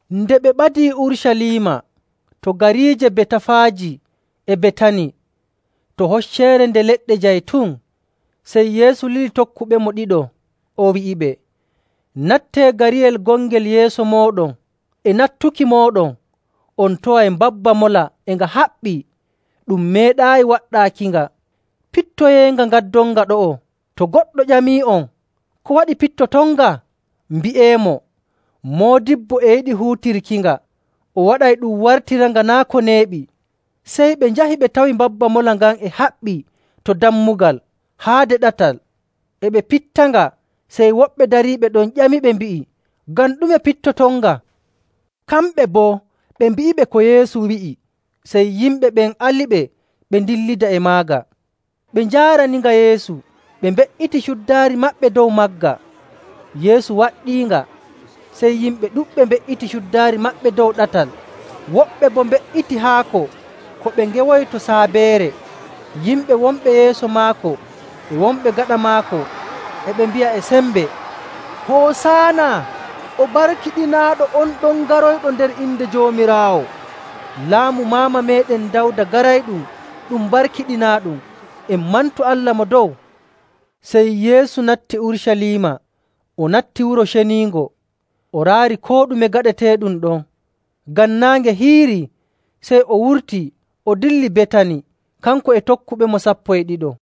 Nde ɓe ɓadii Urucaliima, to gariije Betafaaji e Betani to Hocceere Nde Leɗɗe Jaytun, sey Yeesu lili tokkuɓemo ɗiɗo, o wi'iɓe, “Nattee gariyel gongel yeeso mooɗon. E nattuki mooɗon, on taway mbabba mola e nga haɓɓii, ɗum meeɗaayi waɗɗaakinga. Pittoyeenga ngaddonnga ɗo'o. To goɗɗo ƴamii'on, ‘Ko waɗi pittotonnga?’ mbi'eemo, ‘Moodibbo e yiɗi huutirkinga, o waɗay ɗum wartiranga naa' ko neeɓi.’” Sey ɓe njahi ɓe tawi mbabba mola ngan e haɓɓii to dammugal, haade ɗatal. E ɓe pittanga, sey woɓɓe dariiɓe ɗon ƴamiɓe mbi'i, “Ngam ɗume pittotonnga?” Kamɓe boo ɓe mbi'iɓe ko Yeesu wi'i, sey yimɓe ɓen aliɓe ɓe ndillidi e maaga. Ɓe njaaraninga Yeesu, ɓe mbe''iti cuddaari maɓɓe dow magga. Yeesu waɗɗiinga. Sey yimɓe ɗuɗɓe mbe''iti cuddaari maɓɓe dow ɗatal, woɓɓe boo mbe''iti haako ko ɓe ngewoyi to saabeere. Yimɓe wonɓe yeeso maako e wonɓe gaɗa maako, e ɓe mbi'a e sembe, “Hosaana! O barkiɗinaaɗo on ɗon garoyɗo nder inde Joomiraawo!. Laamu maama meeɗen Dawda garayɗum ɗum barkiɗinaaɗum! En mantu Allah Mo Dow!” Sey Yeesu natti Urucaliima, o natti Wuro Ceniingo, o raari koo ɗume gaɗeteeɗum ɗon. Ngam naange hiirii, sey o wurtii, o dilli Betani kanko e tokkuɓemo sappo e ɗiɗo.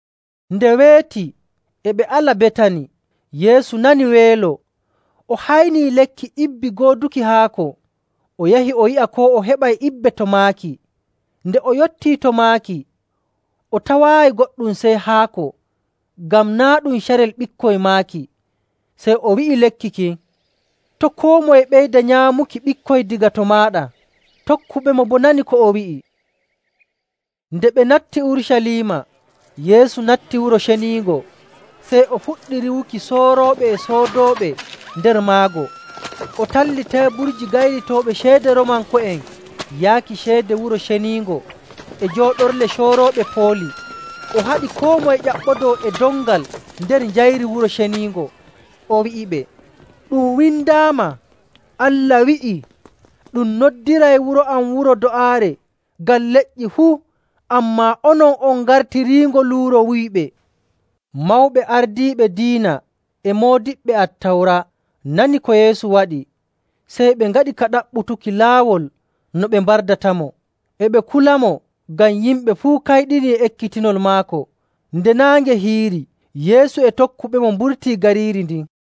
Nde weeti, e ɓe ala Betani, Yeesu nani weelo. O haynii lekki ibbi gooduki haako, o yahi o yi'a koo o heɓay ibbe to maaki. Nde o yottii to maaki, o tawaayi goɗɗum sey haako, ngam naa' ɗum carel ɓikkoy maaki. Sey o wi'i lekki kin, “To' koo moye ɓeyda nyaamuki ɓikkoy daga to maaɗa!” Tokkuɓemo boo nanii ko o wi'i. Nde ɓe natti Urucaliima, Yeesu natti Wuro Ceniingo, sey o fuɗɗi riiwuki soorooɓe e soodooɓe nder maggo. O talli teeburji gaylitooɓe ceede Roomanko'en yaaki ceede Wuro Ceniingo e jooɗorle coorooɓe pooli. O haɗi koo moye ƴaɓɓodoo e dongal nder njayri Wuro Ceniingo. O wi'iɓe, “Ɗum windaama, Allah wi'ii, ‘Ɗum noddiray wuro am wuro do'aare ngam leƴƴi fuu,’ ammaa onon on ngartiriingo luuro wuyɓe.”. Mawɓe ardiiɓe diina e moodiɓɓe Attawra nani ko Yeesu waɗi, sey ɓe ngaɗi ka ɗaɓɓutuki laawol no ɓe mbardatamo. E ɓe kulamo, ngam yimɓe fuu kayɗini e ekkitinol maako. Nde naange hiiri, Yeesu e tokkuɓemo mburtii gariiri ndin.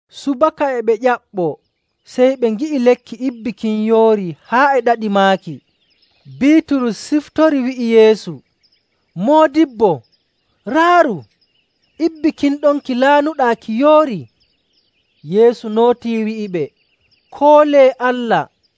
Subaka e ɓe ƴaɓɓoo, sey ɓe ngi'i lekki ibbi kin yoorii haa e ɗaɗi maaki. Biiturus siftori wi'i Yeesu, “Moodibbo, raaru! Ibbi kin ɗon ki laanuɗaa ki yoorii.” Yeesu nootii wi'iɓe, “Koolee Allah.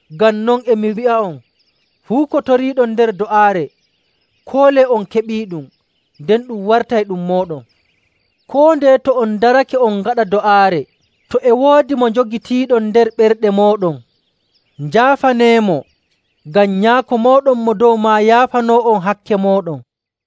Ngam non e mi wi'a'on, fuu ko toriiɗon nder do'aare, koolee on keɓiiɗum, nden ɗum wartay ɗum mooɗon. Koo ndeye to on ndarake on ngaɗa do'aare, to e woodi mo njogitiiɗon nder ɓerɗe mooɗon, njaafaneemo, ngam Nyaako mooɗon Mo Dow maa yaafanoo'on hakke mooɗon.”.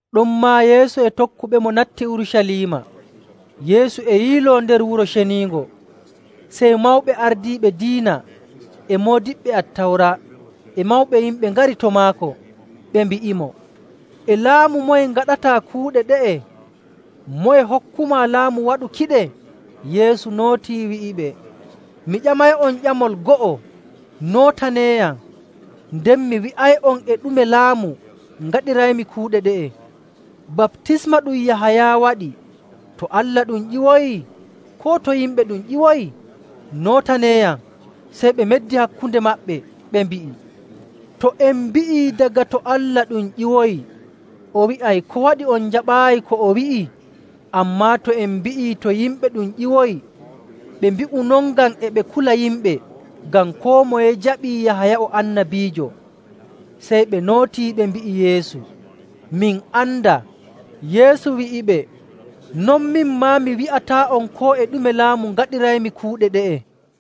Ɗonmaa Yeesu e tokkuɓemo natti Urucaliima. Yeesu e yiiloo nder Wuro Ceniingo, sey mawɓe ardiiɓe diina e moodiɓɓe Attawra e mawɓe yimɓe ngari to maako. Ɓe mbi'imo, “E laamu moye ngaɗataa kuuɗe ɗe'e? Moye hokkumaa laamu waɗukiɗe?” Yeesu nootii wi'iɓe, “Mi ƴamay'on ƴamol go'o. Nootaneeyam, nden mi wi'ay'on e ɗume laamu ngaɗiraymi kuuɗe ɗe'e. Baptisma ɗum Yahaya waɗi, to Allah ɗum ƴiwoyi, koo to yimɓe ɗum ƴiwoyi? Nootaneeyam!” Sey ɓe meddi hakkunde maɓɓe, ɓe mbi'i, “To en mbi'ii, ‘Daga to Allah ɗum ƴiwoyi,’ o wi'ay, ‘Ko waɗi on jaɓaayi ko o wi'i?’ Ammaa to en mbi'ii, ‘To yimɓe ɗum ƴiwoyi…’” Ɓe mbi'u non ngam e ɓe kula yimɓe, ngam koo moye jaɓii Yahaya o annabiijo. Sey ɓe nootii ɓe mbi'i Yeesu, “Min andaa.” Yeesu wi'iɓe, “Non min maa, mi wi'ataa'on koo e ɗume laamu ngaɗiraymi kuuɗe ɗe'e.”